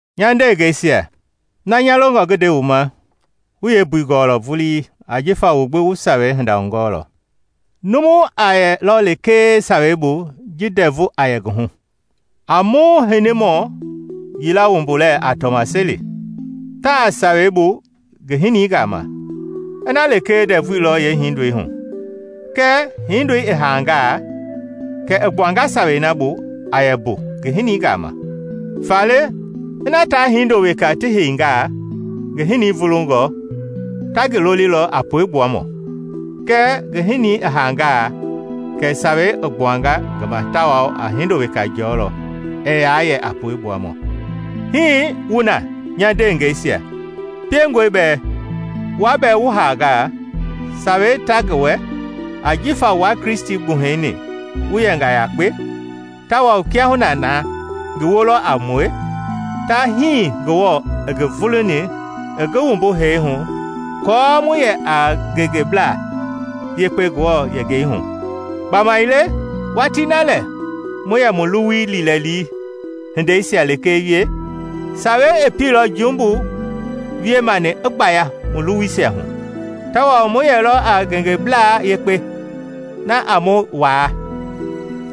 Nya ndeengɛisia, na nya longɔ ngi nde wu ma wu yeembui gɔɔlɔ vulii ajifa wu gbi wu Sawei hinda hugɔɔlɔ. Numu a yɛlɔ lekee Sawei bu ji ndɛvu a yɛ ngi hu. A mu hinimɔ yila wumbu lɛɛ a tɔmasɛi; taa Sawei bu ngi hinii gama ina lekee ndɛvui lɔ yeehindoi hu; kɛɛ hindoi i haangaa, kɛ i gbuanga Sawei na bu a yɛ mbu ngi hinii gama. Faale ina, taa hindo weka ti heingaa ngi hinii vulungɔ, ta ngi lolilɔ a pue gbuamɔ; kɛɛ ngi hinii i haangaa, kɛ sawei i gbuanga ngi ma tawao a hindo weka jɔlɔ ɛɛ yaa yɛ a pue gbuamɔ. Hii wu na, nya ndeengɛisia. Piengɔe bɛɛ wua bɛɛ wu haanga, sawei ta ngi wɛ, ajifa wua Kristi gbuhɛi-ni wu yɛnga yakpe; tawao kiahuna na ngi woo lɔ a mue, ta hii Ngewɔ i ngi vuluni i ngi wumbu hee hu aako mu yɛ a ngengeblaa yekpe Ngewɔ yengei hu. Gbamaile watii na lɛ mu yɛ mu luwui liilɛli hindeisia lekee wie, Sawei i pielɔ jumbu wie mani i gbaya mu luwuisia hu, tawao mu yɛilɔ a ngengeblaa yekpe na a mu waa.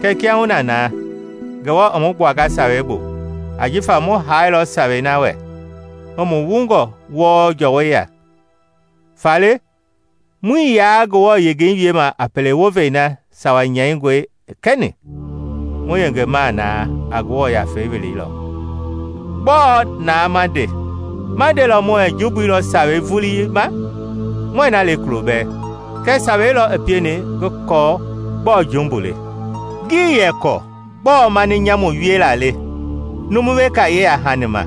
Kɛɛ kiahuna na, Ngewɔ i mu gbuanga Sawei bu ajifa mu haailɔ Sawei na wɛ i mu wungɔ wɔɔ jɔwɔ ya. Faale muii yaa Ngewɔ yengei wiema a pele wovei na Sawa nyɛingɔi i kɛni, mu yengema na a Ngewɔ Yafei welei lɔ. Gbɔɔ naa ma nde? Ma ndelɔ muɛɛ jumbui lɔ Sawei vulii ma? Muɛɛ na le kulobɛɛ! Kɛɛ Sawei lɔ i pieni ngi kɔɔ gbɔɔ jumbu le. Ngii yɛ kɔɔ gbɔɔ mani nyamu wiela le numu weka yeya-hani ma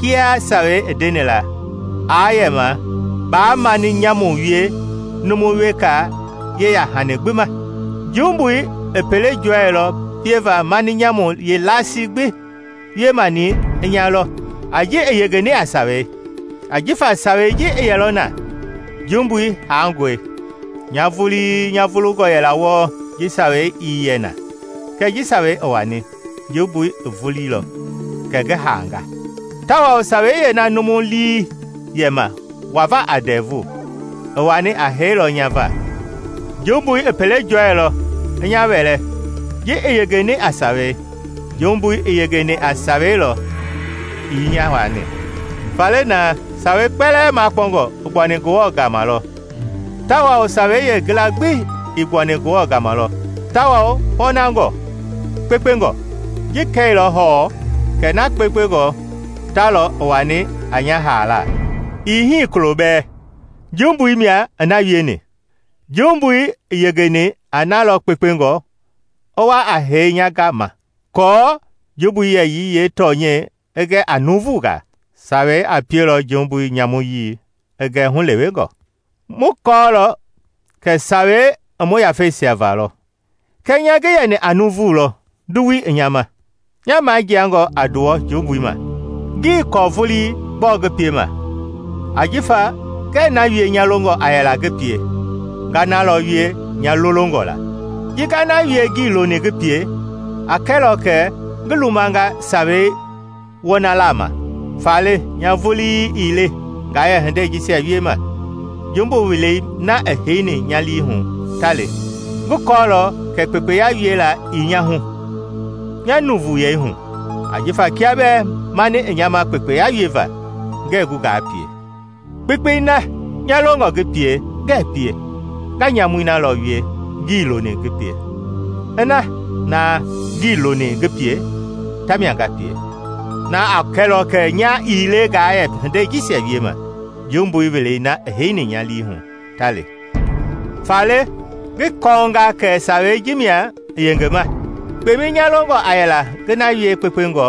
kiaa Sawei ii ndeni aa yɛma, “Baa mani nyamu wie numu weka yeya-hani gbi ma.” Jumbui i pele jɔɛilɔ pieva mani nyamu yeelasii gbi wiemani i nya lɔ a ji i yengeni a Sawei. Ajifa Sawei ji ii yɛlɔ na, jumbui haangɔe. Nya vulii nya vulungɔ yɛla wɔɔ ji Sawei ii yɛ na; kɛɛ ji Sawei i wani, jumbui i vuliilɔ, kɛ ngi haanga. Tawao Sawei yeena numu lii yɛ ma wava a ndɛvu, i wani a hee lɔ nya va. Jumbui i pele jɔɛilɔ i nya wɛlɛ ji i yengeni a Sawei; jumbui i yengeni a Sawei lɔ i nya waani. Faale na Sawei kpɛlɛɛ makpɔngɔ i gbuani Ngewɔ gama lɔ tawao Sawei yeengila gbi i gbuani Ngewɔ gama lɔ, tawao pɔɔnangɔ, kpekpengɔ. Ji kɛilɔ hɔɔ kɛ na kpekpengɔ ta lɔ i wani a nya haala? Ii hii kulo bɛɛ! Jumbui mia i na wieni; jumbui i yengeni a na lɔ kpekpengɔ i wa a hee nya gama aako jumbui yɛyii yeetɔnyɛi i gɛ a nuuvungaa. Sawei a pielɔ jumbui nyamuyii i gɛ hulewengɔ. Mu kɔɔlɔ kɛ Sawei i mu yafeisia va lɔ; kɛɛ nya ngi yɛni a nuuvu lɔ nduwui i nya ma, nya majiangɔ a nduwɔ jumbui ma. Ngii kɔɔ vulii gbɔɔ ngi piema; ajifa ngɛɛ na wie nya longɔ a yɛla ngi pie, nga na lɔ wie nya lolongɔ la. Ji nga na wie ngii loni ngi pie, a kɛlɔ kɛ ngi lumanga Sawei wɔnalaa ma. Faale nya vulii ii le ngaa yɛ hindei jisia wiema; jumbu wielei na i heini nya lii hu, ta le. Ngi kɔɔlɔ kɛ kpekpeya wiela ii nya hu -- nya nuuvuyei hu. Ajifa kia bɛɛ mani i nya ma kpekpe wieva, ngɛɛ gu ngaa pie. Kpekpei na nya longɔ ngi pie, ngɛɛ pie; nga nyamui na lɔ wie ngii loni ngi pie. Ina na ngii loni ngi pie ta mia nga pie, na a kɛlɔ kɛ nya ii le ngaa yɛ hindei jisia wiema; jumbui wielei na i heini nya lii hu, ta le. Faale ngi kɔnga kɛ Sawei ji mia i yengema: kpemɛi nya longɔ a yɛla ngi na wie kpekpengɔ,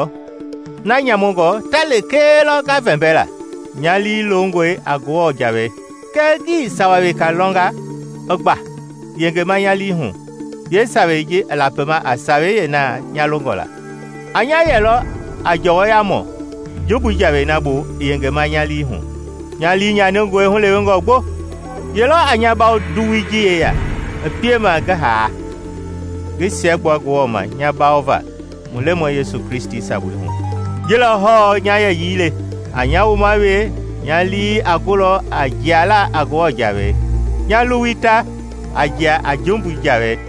na nyamungɔ ta lekee lɔ nga vɛmbɛla. Nya lii longɔe a Ngewɔ Jawei. Kɛɛ ngi sawa weka lɔnga, i gba yengema nya lii hu yeesawei ji a lapi a sawei yeena nya longɔ la. A nya yɛlɔ a jɔwɔyamɔ jumbui jawei na bu i yengema nya lii hu. Nya li nyaningɔe hulewengɔ gbo. Ye lɔ a nya bawo nduwui ji yeya i piema ngi haa? Ngi siɛgbua Ngewɔ ma nya bawo va mu Lemɔi Yesu Kristi sabui hu! Ji lɔ hɔɔ nya yɛyii le: a nya wuma wee nya lii a gulɔ a jialaa a Ngewɔ jawei, nya luwui ta a jia a jumbui jawei.